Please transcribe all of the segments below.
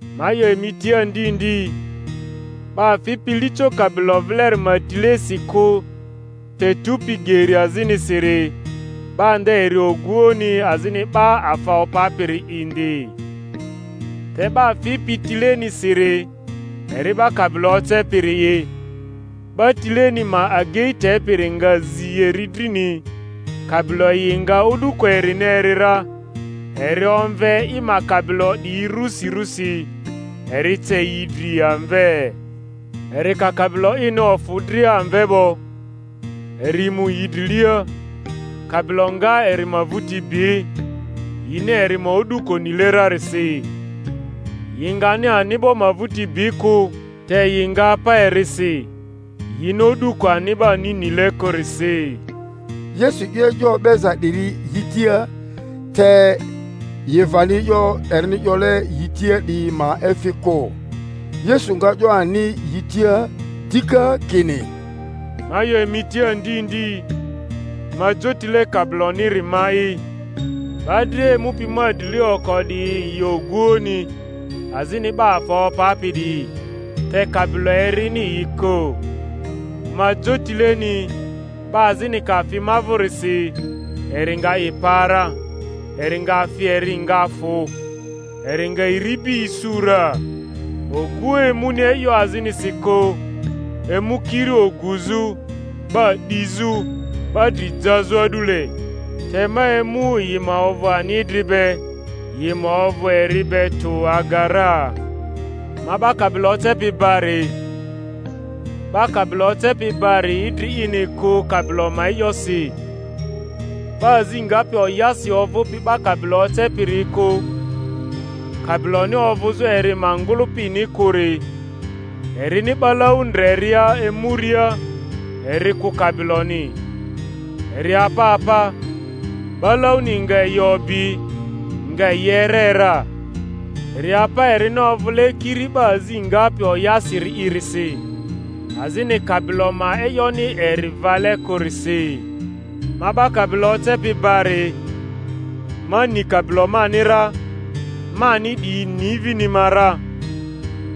Ma 'yo emi tia ndi ndi, 'ba fipi lico kabilo vileri ma tilesi kᴜ te tupi geri azinisiri, 'ba nde eri ogᴜoᴜni azini 'ba afa opapiri indi. Te 'ba fipi tilenisiri eri 'ba kabilo ocepiri'i. 'Ba tileni ma agei tepiri nga zi eri drini; kabilo yi nga o'duko erini eri ra, eri omve i ma kabilo 'diyi rᴜsi rusi, eri ce yi dri amve. Eri ka kabilo ini ofᴜ dria amve 'bo, eri mu yi drilia, kabilo nga eri ma vᴜti bi, yini eri ma o'duko nile rarisi. Yi ngani ani'bo ma vᴜti bi kᴜ, te yi nga apa erisi, yini o'duko ani'bani nile kᴜrisi. Yesu 'yo e'yo o'beza 'diri yi tia, te yi vani e'yo erini 'yole yi tia 'diyi ma efi kᴜ Yesu nga 'yo ani yi tia dika kini, Ma 'yo emi tia ndi ndi, ma jotile kabiloniri ma'i. 'Ba dria emupi ma drilia oko 'diyi yi oguoᴜni azini 'ba afa opapi 'diyi; te kabilo erini yi kᴜ. Ma jotileni; 'ba azini ka fi ma vᴜrisi, eri nga i pa ra, eri nga fi eri nga fᴜ, eri nga iribi isu ra. Oguoᴜ emuni e'yo azinisi kᴜ, emu kiri oguzᴜ, 'ba 'dizᴜ, 'ba dri jazᴜ a'dule; te ma emu yi ma ovᴜ ani idri be, yi ma ovᴜ eri be tᴜ aga ra. Ma 'ba kabilo ocepi bari. 'Ba kabilo ocepi bari idri ini kᴜ kabilo ma e'yosi. 'Ba azi ngapi oyasi ovᴜpi 'ba kabilo ocepiriyi kᴜ, kabiloni ovᴜzᴜ eri ma ngᴜlᴜpini kᴜri, erini 'balau ndreria emuria eri kᴜ kabiloni, eri apa apa, 'balauni nga yi obi, nga yi ere ra. Eri apa erini ovᴜle kiri 'ba azi ngapi oyasiri'irisi, azini kabilo ma e'yoni eri vale kᴜrisi. Ma 'ba kabilo ocepi bari; ma ni kabilo mani ra, mani 'diyi ni vini ma ra,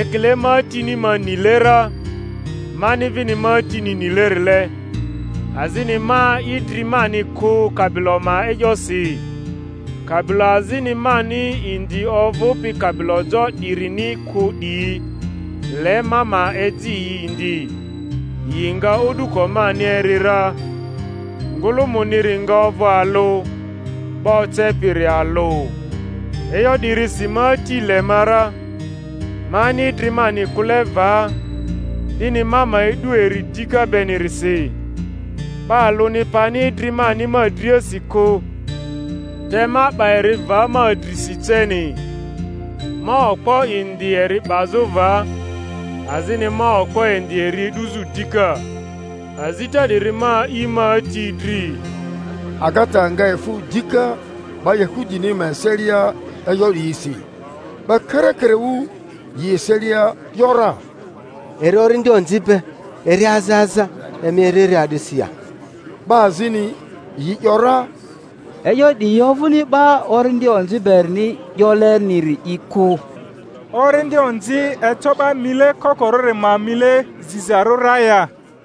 ekile ma Atini ma nile ra, mani vini ma Atini nilerile; azini ma idri mani kᴜ kabilo ma e'yosi. Kabilo azini mani indi ovᴜpi kabilo jo 'dirini kᴜ 'diyi; le ma ma eji yi indi, yi nga o'duko mani eri ra. Ngᴜlᴜmᴜniri nga ovᴜ alᴜ, 'ba ocepiri alᴜ. E'yo 'dirisi ma Ati le ma ra, mani idri mani kᴜle va, 'dini ma ma e'du eri dika benirisi. 'Ba alᴜni pani idri mani ma driasi kᴜ, te ma 'ba eri va ma drisi ceni. Ma okpo indi eri 'bazᴜ va, azini ma okpo indi eri e'duzᴜ dika. Azita 'diri ma a'i ma Ati dri. Agata nga efᴜ dika 'ba Yahudini ma eselia e'yo 'diyisi. 'Ba karakaraᴜ yi eselia ‘yora, Eri orindi onzi be, eri aza aza; emi eri eri a'disi ya? 'Ba azini yi ‘yora, E'yo 'diyi ovᴜni 'ba orindi onzi berini 'yoleniri'i kᴜ. Orindi onzi eco 'ba mile kokorᴜri ma mile zizarᴜ ra ya?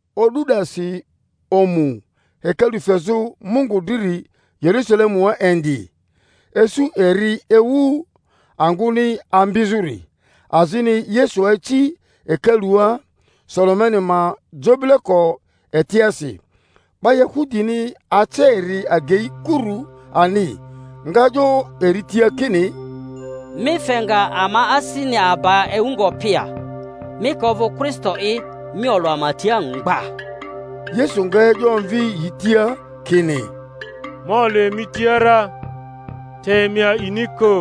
O'du 'dasi omu hekalu fezᴜ Mungu driri Yerusalemua indi; isu eri ewu angᴜni ambizᴜri, azini Yesu aci hekalua Sulemani ma jobileko etiasi. 'Ba Yahudini ace eri agei kurᴜ ani, nga 'yo eri tia kini, mi fe nga ama asini aba ewu ngopi ya? Mi ka ovᴜ Kristo'i, mi olᴜ ama tia mgba. Yesu nga e'yo omvi yi tia kini, Ma olᴜ emi tia ra, te emi a'ini kᴜ.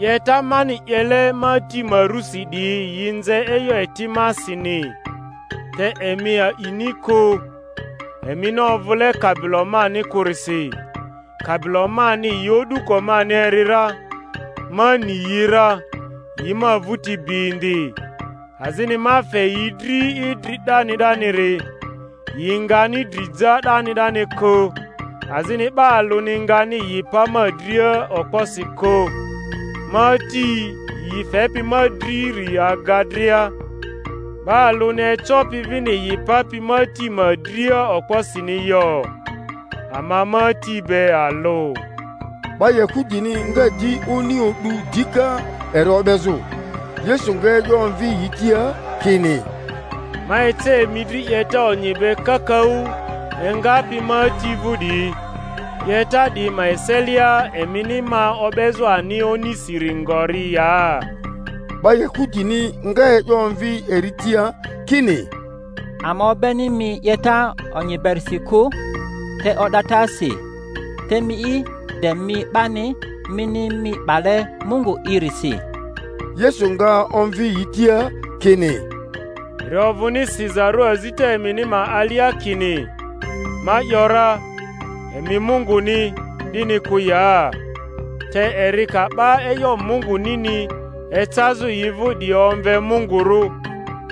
'Yeta mani 'yele ma Ati ma rusi 'diyi yi nze e'yo eti masini; te emi a'ini kᴜ, emini ovᴜle kabilo mani kᴜrisi. Kabilo mani yi o'duko mani eri ra, ma ni yi ra, yi ma vᴜti bi indi; azini ma fe yi dri idri 'dani 'daniri; yi ngani dri ja 'dani 'dani kᴜ, azini 'ba alᴜni ngani yi pa ma dria okposi kᴜ. Ma Ati yi fepi ma driri aga dria; 'ba alᴜni ecopi vini yi papi ma Ati ma dria okposini yo. Ama ma Ati be alᴜ. 'Ba Yahudini nga di oni o'du dika eri o'bezᴜ. Yesu nga e'yo omvi yi tia kini, Ma ece emi dri 'yeta onyi be kakaᴜ engapi ma Ati vᴜ 'diyi; 'yeta 'diyi ma eselia emini ma o'bezᴜ ani onisiri ngori ya? 'Ba Yahudini nga e'yo omvi eri tia kini, Ama o'beni mi 'yeta onyi berisi kᴜ, te o'datasi; te miyi, de mi 'bani, mini mi 'bale Mungu'irisi. Yesu nga omvi yi tia kini, Eri ovᴜni sizarᴜ azita emini ma alia kini, Ma ‘yora, emi mungᴜni, 'dini kᴜ ya? Te eri ka 'ba e'yo Mungᴜnini ecazᴜ yi vᴜ 'diyi omve mungurᴜ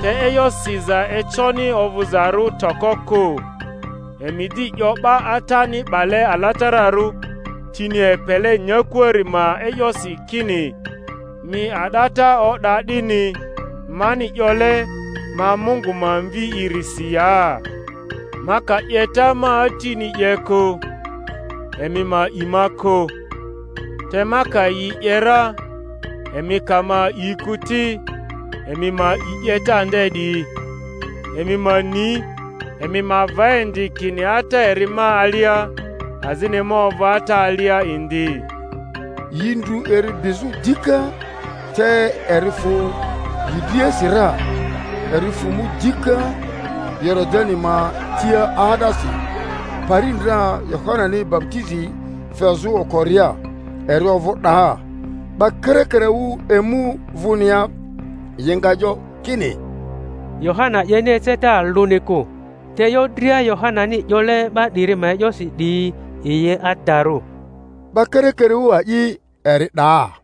(te e'yo siza econi ovᴜzarᴜ toko kᴜ), emi di 'yo 'ba Atani 'bale alatararᴜ, tini epele nyakuari ma e'yosi kini, Mi a'data o'da, 'dini, mani 'yole, Ma Mungu ma Mvi'i-risi ya? Ma ka 'yeta ma Atini 'ye kᴜ, emi ma a'i ma kᴜ; te ma ka yi 'ye ra, emi ka ma a'i kᴜ ti, emi ma a'i 'yeta nde 'diyi; emi ma ni, emi ma va indi kini Ata eri ma alia, azini ma ovᴜ Ata alia indi. Yi ndru eri bizᴜ dika, te eri fᴜ yi driasi ra. Eri fᴜ mu dika Yoridani ma tia 'aa'dasi, pari ndra Yohanani baputizi fezᴜ okoria, eri ovᴜ 'daa. 'Ba karakaraᴜ emu vᴜnia; yi nga 'yo kini, Yohana 'yeni eceta alᴜni kᴜ, te e'yo dria Yohanani 'yole 'ba 'diri ma e'yosi 'diyi yi adarᴜ. 'Ba karakaraᴜ a'i eri 'daa.